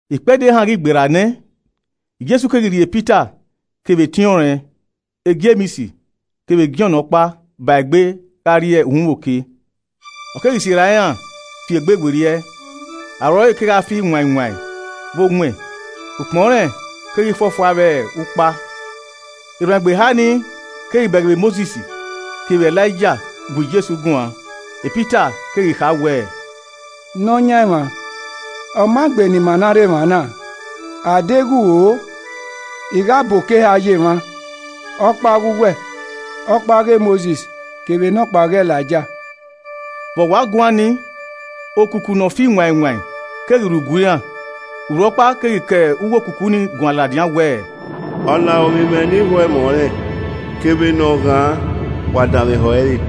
Ikpẹdẹ ehan ghi gberra nẹ, Jesu keghi rhie Pita kevbe etiọnrẹn Jems kevbe Jọn ọkpa ba egbe gha rrie uhunmwu oke. Ọ keghi sirra iran fi egbe werriẹ, aro ẹre kegha fi wain wain vbe owẹn, ukpọn rẹn keghi fuọfua vbe ukpa. Erhuanegbe eha nii keghi bẹghe vbe Mosis kevbe Elaija gu Jesu guan. Pita keghi kha wẹẹ, “Nọyaẹnmwa, ọ maa gbe ni ima na rre emwa na, a deghẹ u ho, I gha bọ eko eha ye emwa, ọkpa ọghe uwẹ, ọkpa ọghe Mosis kevbe nọkpa ọghe Elaija.” Vbene ọ wa guan ni, okuku ne ọ fi wain wain keghi rhu gue iran, urhu ọkpa keghi ke uwu okuku nii guan ladian wẹẹ, “Ọna ọre ovbi mwẹ ne I ho ẹmwẹ ọnrẹn kevbe ne ọ ghan, wa danmwehọ ẹre.”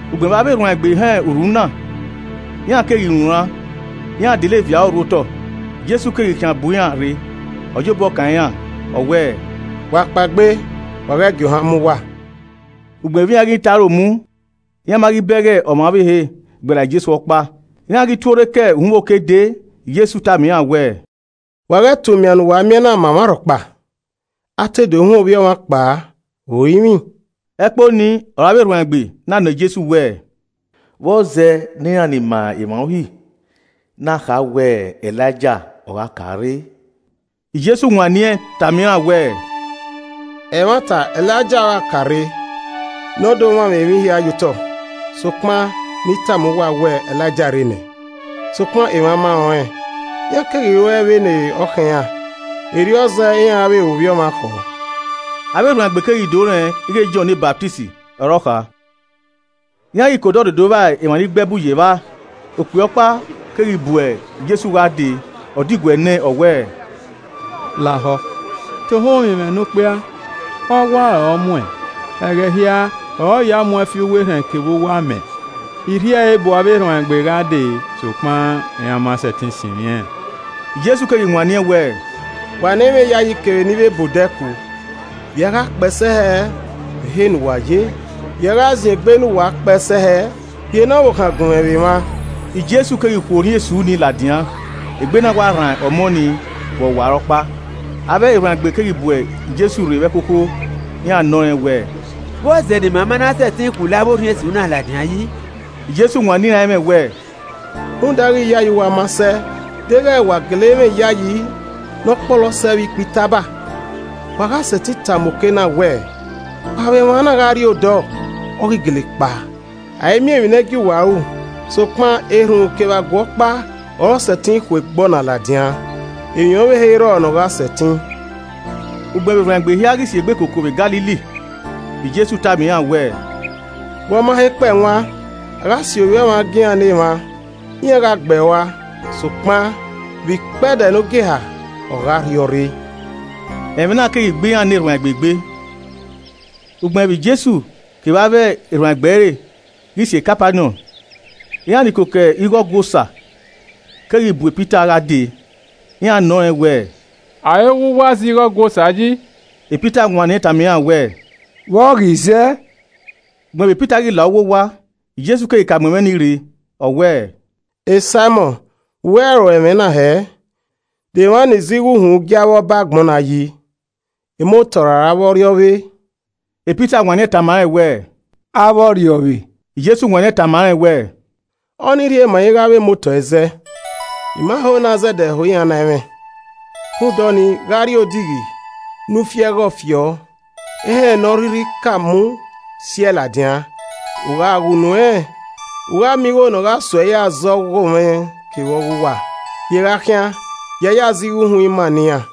Ugbẹn vbe avbe erhuanegbe họn urhu na, iran keghi runran, iran dele viọ aro rhu otọ. Jesu keghi khian bu iran rre, ọ ya obọ kan iran, ọ wẹẹ, “Wa kpaegbe, wa ghẹ gie ohan mu uwa.” Ugbẹn vbe iran ghi tọn aro mu, iran ma ghi bẹghe ọmwa ọvbehe gberra Jesu ọkpa. Iran ghi tuorre ke uhunmwu oke dee, Jesu tama iran wẹẹ, “Wa ghẹ ta umian ne uwa miẹn na ma ọmwa rhọkpa, a te do huẹn Ovbi Ọmwa kpao vbe orinmwi.” Ẹkpo ni ọre avbe erhuanegbe na nọọn Jesu wẹẹ, “Vbọzẹ ne iran ni ma emwa Uhi na kha wẹ Elaija ọ gha ka rre?” Jesu wanniẹn tama iran wẹẹ, “Ẹmwata Elaija ogha ka re ne ọ do mwamwa emwi hia ye otọ. Sokpan, ne I tama uwa wẹẹ, Elaija rre nẹ, Sokpan emwa ma rẹn ọnrẹn, iran keghi ruẹe vbe ne ọ khọn iran. Erriọ zẹ iran ra vbe ru Ovbi Ọmwa khọọ.” Avbe erhuanegbe keghi do rẹn ighe Jọn ne Ọsamẹ ọre ọ kha. Iran ghi ke odọ rre do vba emwa ni gbe ẹbu ye evba, okpia ọkpa keghi bu Jesu gha dee, ọ diguẹ nẹẹn ọ wẹẹ, “Lahọ tohan ovbi mwẹ nokpia! Ọwa ọre ọ mu ẹn, ẹghẹ hia ọre ọ ya mu ẹn fi uwu erhẹn kevbe uwu amẹ. I rhie ẹre bu avbe erhuanegbe gha dee sokpan iran ma sẹtin sinmwi ẹn.” Jesu keghi wanniẹn wẹẹ, “Wa ne ẹ i mwẹ iyayi kevbe ni vbe ba odẹ ku! Vbe i a gha kpee sẹ hẹ vbe ehe ne uwa ye? Vbe i a gha ziengbe ne uwa kpee sẹ hẹ? Rhie ne ọvbokhan gun mwẹ vbe emwa.” Jesu keghi khu orhiọn esu ni ladian, egbe na wa rran ọmọ nii vbe ọwarọkpa. Avbe erhuanegbe keghi bu Jesu rre vbe ẹkhokho, iran nọ rẹn wẹẹ, “Vbọzẹ ne ima ma na sẹtin khu orhiọn esu ni ladian yi?” [ Jesu wanniẹn iran ẹmwẹ wẹẹ, “Rhunmwuda ighe iyayi uwa ma sẹ. Deghẹ wa gele mwẹ iyayi ne ọ kpọlọ sẹ vbe ikpẹ itaba, wa gha sẹtin tama oke na wẹẹ, ‘Kpao vbe emwa gha rrie odọ.’ Ọ ghi gele kpao. A i miẹn emwi ne ẹ i gie uwa ru. Sokpan erhunmwu kevbe aguẹ ọkpa ọre ọ sẹtin khu egbe ọna ladian, emwi ọvbehe i rrọọ ne ọ gha sẹtin.]” Ugbẹn vbe erhuanegbe hia ghi si egbe koko vbe Galili, Jesu tama iran wẹẹ, “Vbe ọ ma he kpẹe wan, a gha si Ovbi Ọmwa gie iran ne emwa. Iran gha gbe ẹe rua, sokpan, vbe ikpẹdẹ ne ogieha, ọ gha rhiọrre.” Ẹmwẹ na keghi gbe iran ne erhuanegbe egbe. Ugbẹn vbe Jesu kevbe avbe erhuanegbe ẹre ghi sẹ Kapaniọn, iran ni koko igho Ọgua Osa keghi bu Pita gha dee, iran nọ ẹnrẹn wẹẹ “Arowa uwa zẹ igho Ọgua Osa yi?” Pita wanniẹn tama iran wẹẹ, “Vbọ ghi zẹ.” Ugbẹn vbe Pita ghi la uwu owa, Jesu keghi ka mu ẹmwẹ ni rre, ọ wẹẹ, “Saimọn, vbe uwẹ ro ẹmwẹ na hẹẹ? De emwa ni zẹ igho uhunmwu gie avbe ọba agbọn na yi? Emotọ ra avbe ọrriọvbe?” Pita wanniẹn tama rẹn wẹ, “Avbe ọrriọvbe.” Jesu wanniẹn tama rẹn wẹẹ, “Ọnii rhie ma ighe avbe emotọ i zẹ. I ma ho ne a zẹdẹ ho iran na ẹmwẹ. Rhunmwuda ọnii, gha rrie odighi ne u fi ẹghọe fi ọ, ehẹn ne ọ rhirhi ka mu, si ẹe ladian. U gha ghe unu ẹnrẹn, u gha miẹn igho ne ọ gha sẹ uẹ ya zẹ ọghomwẹ kevbe ọghe uwa, rhie gha khian, ya ya zẹ igho uhunmwu ima ne iran.”